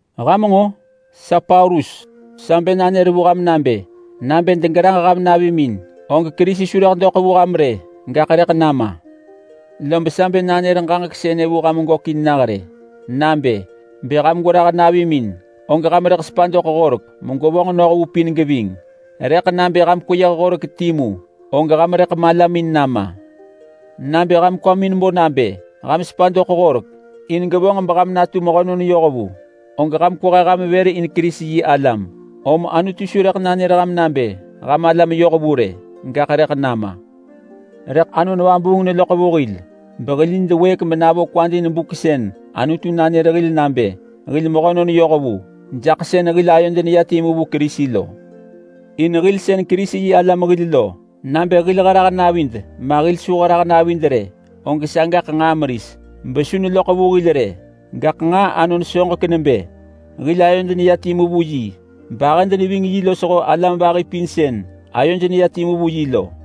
Ham nġo! Sa Paulus sa bë nanër vu ham nabë: Nabë degerah ham navimin, og Kerisi su rëḳ doḳ vu ham rë, gaḳ rëḳ nama! Lob sa bë nanër ġaġek sënë vu ham gökin nah rë nabë: Bë ham gwerah navimin, og ham rëḳ sepa doḳ Horek megwevonġ noh vu pin geving. Rëḳ nabë ham kweyëh horek timu og ham rëḳ malamin nama. Nabë ham kwamin bo nabë ham sepa doḳ Horek in gevonġ meham natu mehönon yohvu, og ham kwehe ham vër in Kerisi-yi-alam. Om Anutu su rëḳ nanër ham nabë ham alam yohvu rë, gaḳ rëḳ nama. Rëḳ Anon Vabuung neloḳ vu hil behil nid wëëk menavo kwad in buk sën Anutu nanër hil nabë hil mehönon yohvu jaḳ sën hil ayod neya timu vu Kerisi lo. In hil sën Kerisi-yi-alam hil lo, nabë hil herah navid ma hil su herah navid rë, og sagaḳ nġaa meris besu neloḳ vu hil rë. Gaḳ nġaa anon soġek nebë hil ayod neya timu vu yi, bahëd neving yi losho alam vahi pin sën ayoj neya timu vu yi lo.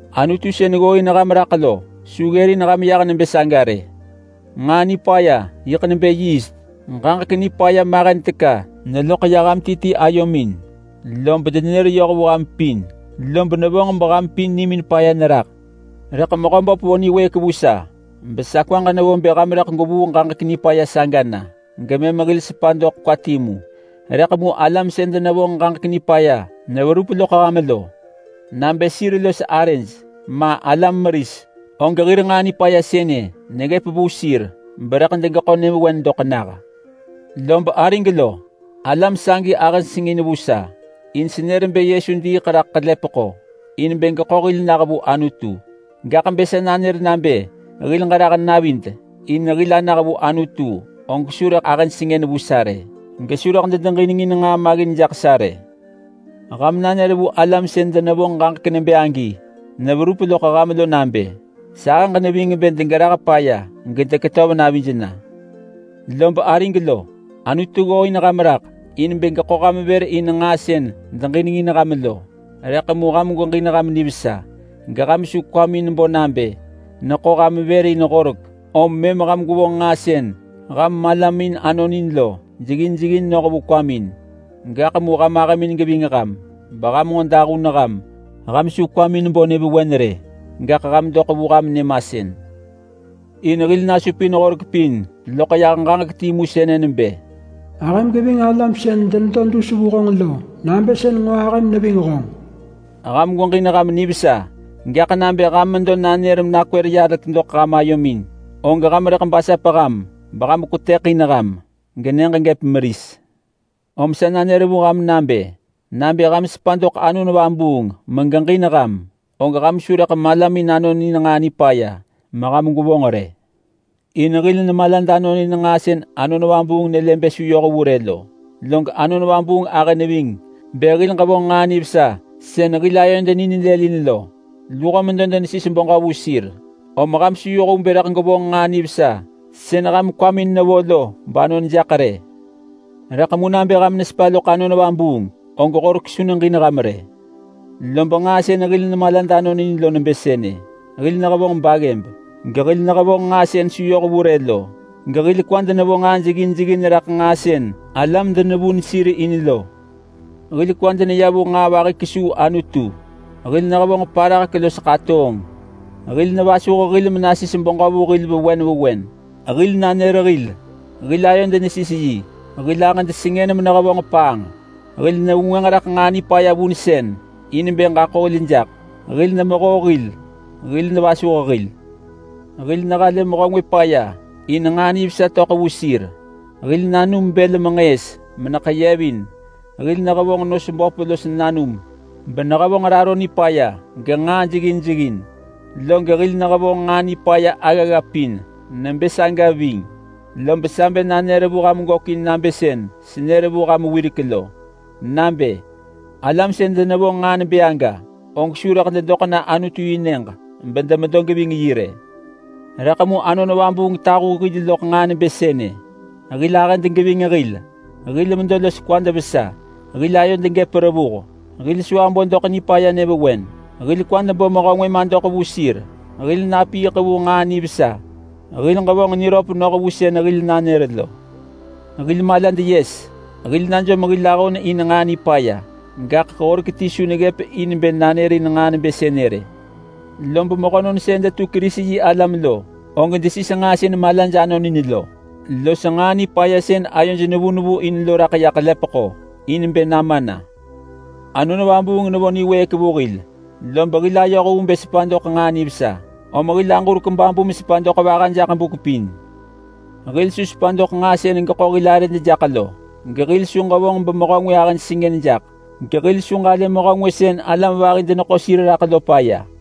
Anutu sën ggooin ham raḳ lo su ggërin ham yah nebë saga rë! Nġaa nipaya yiḳ nebë yiist. Ġaġek nipaya mahen teka neloḳ ya ham ti ti ayomin, lob denenër yoh vu ham pin lob nevonġ beham pin nimin paya neraḳ. Rëḳ Mehöböp vo niwëëk vu sa besa kwaġ nevo bë ham rëḳ gwevuu ġaġek nipaya saga na, gemëm hil sepa doḳ kwa timu. Rëḳ mu alam sën denevonġ ġaġek nipaya neverup loḳ ham lo, nabë sir los arëj ma alam meris, og hir nġaa nipaya sënë neggëp vu sir berëḳ degeḳo nyëvewen doḳ nah. Lob arig lo, alam sagi ahëj sengën vu sa, in senër bë Yesu diiḳ raḳ ḳelepeḳo in bë geḳo hil nah vu Anutu. Gaḳ bë sa nanër nabë hil ġerah navid in bë hil anah vu Anutu, og su rëḳ ahëj sengën vu sa rë, gesu rëḳ dedeġinengin nġaa maggin jaḳ sa rë. Ham nanër vu alam sën denevonġ ġaġek nebë agi neverup loḳ ham lo nabë sahëġ neving bë degerah paya gedeketöv navij na! Lob arig lo, Anutu ggooin ham raḳ in bë geḳo ham vër in nġaa sën deġinengin ham lo. Rëḳ mu ham gweġin ham nivesa geham su kwamin bo nabë neḳo ham vër in Horek, om mëm ham gwevonġ nġaa sën ham malamin anonin lo jeggin jeggin noh vu kwamin. Gaḳ mu ham ahëmin geving ham beham nġo dahun ham. Ham su kwamin bo nyëvewen rë, gaḳ ham doḳ vu ham nyëmasën. In hil nasupin Horek pin loḳ yah ġaġek timu sënë nebë: Ahëm geving alam sën denedo dus vu honġ lo nabë sën nġo ahëm neving honġ! Ham gweġin ham nivesa. Gaḳ nabë ham medo nanër ham menakwër yalek doḳ ham ayomin, og ham rëḳ basap ham beham kwetëḳin ham genyëġ gëp meris. Om sa nanër vu ham nabë: Nabë ham sepa doḳ Anon Vabuung megeġin ham, og ham su rëḳ malamin anonin nġaa nipaya meham gwevonġ rë. In hil nemalad anonin nġaa sën Anon Vabuung nelë bë su yoh vu rë lo, log Anon Vabuung ahë neving bë hil ġevonġ nġaa nivesa sën hil ayod ninelëlin lo. Luho medo denesis beġö vu sir, om ham su yoh vu bë rëḳ gwevonġ nġaa nivesa sën ham kwamin nevo lo banon jaḳ rë. Rëḳ mu nabë ham nesepa loḳ Anon Vabuung, og Horek su neġin ham rë. Lob nġaa sën hil nemalad anonin lo nebë sënë: Hil nehevonġ baggëb, gehil nehevonġ nġaa sën su yoh vu rë lo, gehil kwad nevo nġaa jeggin jeggin raḳ nġaa sën alam denevun sir in lo. Hil kwad neya vu nġaa vahi kesuu Anutu, hil nehevonġ parahek los ḳatoonġ. Hil nevasuh hil menasis beġö vu hil vewen vewen, hil nanër hil, hil ayod nesis yi, hil ahëd sengën menehevonġ paanġ. Hil nevengwënġ raḳ nġaa nipaya vunsën in bë ġaḳo hil jaḳ, hil nemehoo hil, hil nevasuh hil. Hil nehalë mehö ngwë paya in nġaa nivesa töḳ vu sir, hil nanum bël menġëës meneḳeyevin, hil nehevonġ nos böp los nanum benehevonġ raro nipaya genġaa jeggin jeggin, log hil nehevonġ nġaa nipaya aggagga pin nebë saga ving. Lob sa bë nanër vu ham gökin nabë sën senër vu ham wirek lo nabë: Alam sën denevonġ nġaa nebë aga, og su rëḳ dedoḳ na Anutu-yi-nyëġ bedemedo geving yi rë. Rëḳ mu Anon Vabuung tahu hil loḳ nġaa nebë sënë: Hil ahëd geving hil, hil medo los kwad vesa, hil ayod gëp revuh, hil su abo doḳ nipaya nyëvewen, hil kwad bo mehö ngwë madoḳ vu sir, hil napiiḳ vu nġaa nivesa, hil ġevonġ niröp noh vu sën hil nanër lo. Hil malad yes, hil najom hil ahon in nġaa nipaya. Gaḳ horek ti su neggëp in bë nanërin nġaa nebë sënë rë. Lob mehönon sën detu Kerisi-yi-alam lo, og desis nġaa sën malaj anonin lo los nġaa nipaya sën ayoj nevu nevu in lo raḳ ya ḳelepeḳo in bë nama na. Anon Vabuung nevo niwëëk vu hil, lob hil ayoh vu bë sepa doḳ nġaa nivesa, om hil aġurek babu mesepa doḳ vaha jaḳ buk pin. Hil su sepa doḳ nġaa sën geḳo hil arëd jaḳ lo, gehil su ġevonġ bemehö ngwë ahë sengën jaḳ, gehil su ġalë mehö ngwë sën alam vahi deneḳo sir raḳ lo paya.